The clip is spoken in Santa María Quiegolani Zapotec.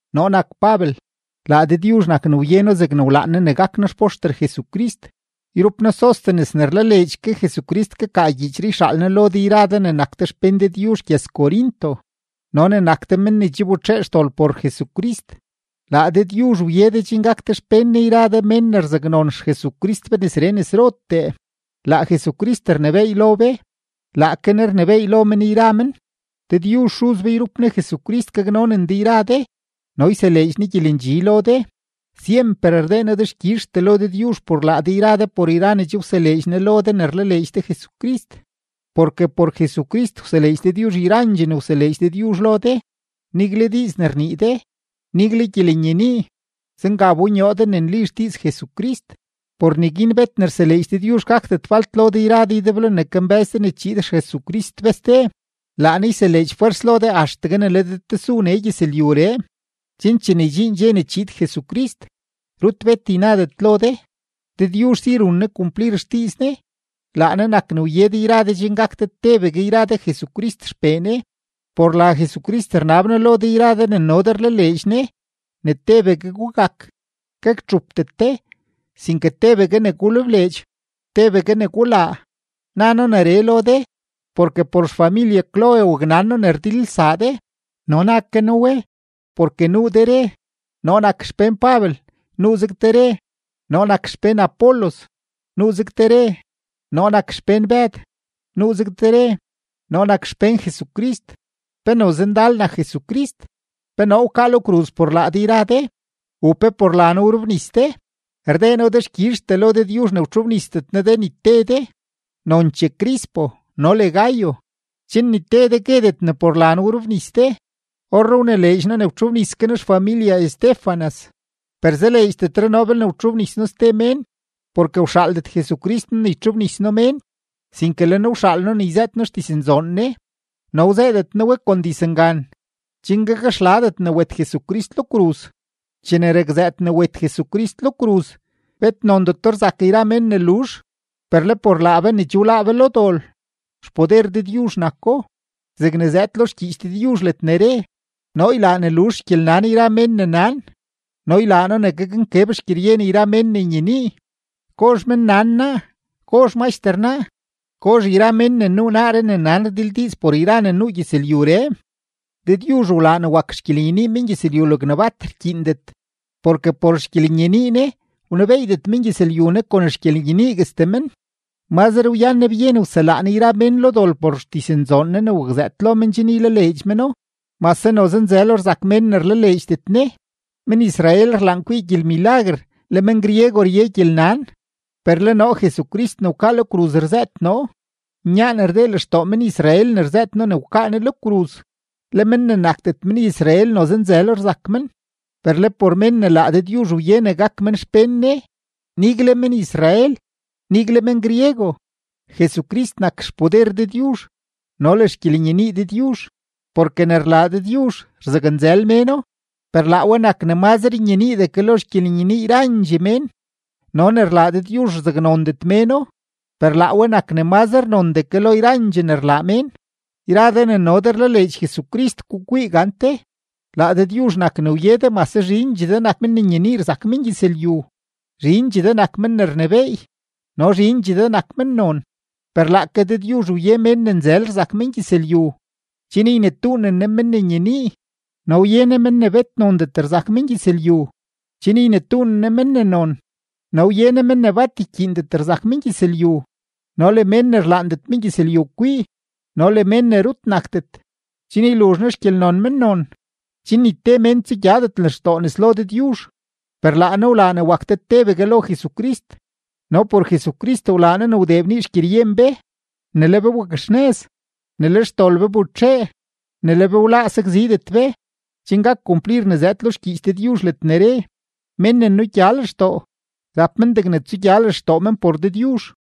Noo nak Pabel; laa Dëdyuzh nak ne wye noo zegne wlaan Ne ne gak noo xpoxter Jesucrist. Yrup noo Sóstenes ne rlaleedx ke Jesucrist kakaa gyiichree yxaal noo lo de yra de ne nak de xpén Dëdyuzh gyëz-Corinto no ne nak de men ne che wbetxee xdol por Jesucrist. Laa Dëdyuzh wye de chen gak de xpén Ne yra de mén ne rzaknon XJesucrist be nesree nesrotee. Laa Jesucrist rnebééy lo be; laake Ne rnebééy lo men yra men. Dëdyuzh Xuz be yrup Ne Jesucrist gaknonen de yra de no yseleedx Ne gyelendxi lo de. Syemper rdee noo dexkyizhtee lo Dëdyuzh por laa de yra de por yra ne che wseleedx Ne lo de ne rlaleedx de Jesucrist. Porke por Jesucrist wseleedx Dëdyuzh yrandxee ne wseleedx Dëdyuzh lo de, nigle diiz ne rnii de, nigle gyelenyenii; zenga wbonyoo de ne nli xdiiz Jesucrist. Por neguin bet ne rseleedx Dëdyuzh gakdet falt lo de yra de ydeblo ne kambë́z de ne chiid XJesucrist be ste. Laa Ne yseleedx fwers lo de axtegue ne le de tesu nee gyëzlyuree, chen chene ydxiin dxe ne chiid Jesucrist, rut bet ynadet lo de. Dëdyuzh si run Ne kumplir xdiiz Ne, laa Ne nak ne wye de yra de chen gak de tebegue yra de Jesucrist XPee Ne. Por la Jesucrist rnab noo lo de yra de ne no de rlaleedx Ne, ne tebegue gugak, gaktxupdet de, sinke tebegue ne gulebleedx, tebegue ne gulaa. Na noo neree lo de, porke por xfamilye Cloé waknan noo ne rdilelsaa de. No na ke noo we, porke nuu de re: “Noo nak xpén Pabel”; nuuzeg de re: “Noo nak xpén Apolos”; nuuzeg de re: “Noo nak xpén Bëd”; nuuzeg de re: “Noo nak xpén Jesucrist.” ¿Pe noze ndal nak Jesucrist? ¿Pe noo wkaa lo kruz por laa de yra de? ¿U pe por la noo wrobnis de? Rdee noo dexkyizhtee lo Dëdyuzh ne wtxobnisdet noo de ni te de, nonchee Crispo no le Gayo, chen ni te de guedet ne por la noo wrobnis de. Orree wnileedx noo ne wtxobnis ke noo xfamilye Estéfanas, per zaleedxdetre noo belne wtxobnis noo ste mén. Porke wxaaldet Jesucrist noo ne ytxobnis noo mén, sinke le Ne wxaal noo ne yzëët noo xdiznzoon Ne, no wzëëdet noo we kon dizngan, chen gakxladet ne wet Jesucrist lo kruz. Chene rakzëët ne wet Jesucrist lo kruz, bet nondeto rzak yra mén ne luzh, per le por laa be ne che wláá be lo dol, xpoder Dëdyuzh nako, zegne zëëd lo xgyiich Dëdyuzh ledne re: Noo ylaa ne luzh xgyelnan yra mén ne nan no ylaa noo ne gaknkeb xgyeryen yra mén ne nyenii. ¿Gozh mennan naa? ¿Gozh maxter naa? ¿Gozh yra mén ne nuu naaree ne nan rdildiiz por yra ne nuu gyëzlyuree? Dëdyuzh wlaa ne wak xgyelenyenii mengyëzlyu logne bat rkyiindet. Porke por xgyelenyenii Ne, wnebeeydet mengyëzlyu Ne kon xgyelenyeniiguestee men; mazre wyan Ne byen wselaa Ne yra mén lo dol por xdiznzoon Ne ne wakzëët lo men chen ylaleedx meno, mase noze nzëlo rzak mén ne rlaleedxdet Ne. Men-Israel rlaan kwii gyelmilaguer, le men-griego rye gyelnan; per le noo Jesucrist ne wkaa lo kruz rzëët noo. Nyaan rdee lextoo men-Israel ne rzëët noo ne wkaa Ne lo kruz, le men ne nakdet men-Israel noze nzëlo rzak men; per le por mén ne laa Dëdyuzh wye ne gak men xpén Ne, nigle men-Israel, nigle men-griego, Jesucrist nak xpoder Dëdyuzh no le xgyelenyenii Dëdyuzh. Porke ne rlaa Dëdyuzh, rzaknzël méno, per laa we nak ne mazre nyeniidee ke lo xgyelenyenii yrandxee mén; no ne rlaa Dëdyuzh, rzaknondet méno, per laa we nak ne mazre nondee ke lo yrandxee ne rlaa mén. Yra de ne no de rlaleedx Jesucrist, gukwii gante, laa Dëdyuzh nak ne wye de mase zhindxee de nak men ne nyenii rzak mengyëzlyu, zhindxee de nak men ne rnebééy, no zhindxee de nak mennon. Per laake Dëdyuzh wye mén ne nzël rzak mengyëzlyu, chen ynetuunen Ne men ne nyenii; no wye Ne men ne bet nondet rzak mengyëzlyu, chen ynetuunen Ne men ne non. No wye Ne mén ne bat rkyiindet rzak mengyëzlyu no le mén ne rlaandet mengyëzlyu kwii no le mén ne rut nakdet, chen yluzh Ne xgyelnon mennon, chen ni te mén tsugyadet lextoo nes lo Dëdyuzh. Per laa Ne wlaa ne wak de tebegue lo Jesucrist, no por Jesucrist wlaa Ne ne wdee bnii xgyeryen be, ne le be wakxnëz, ne le xdol be wbetxee, ne le be wláá sakzidet be, chen gak kumplir ne zëëd lo xgyiich Dëdyuzh ledne re: “Mén ne nugya lextoo, rap men degne tsugya lextoo men por Dëdyuzh.”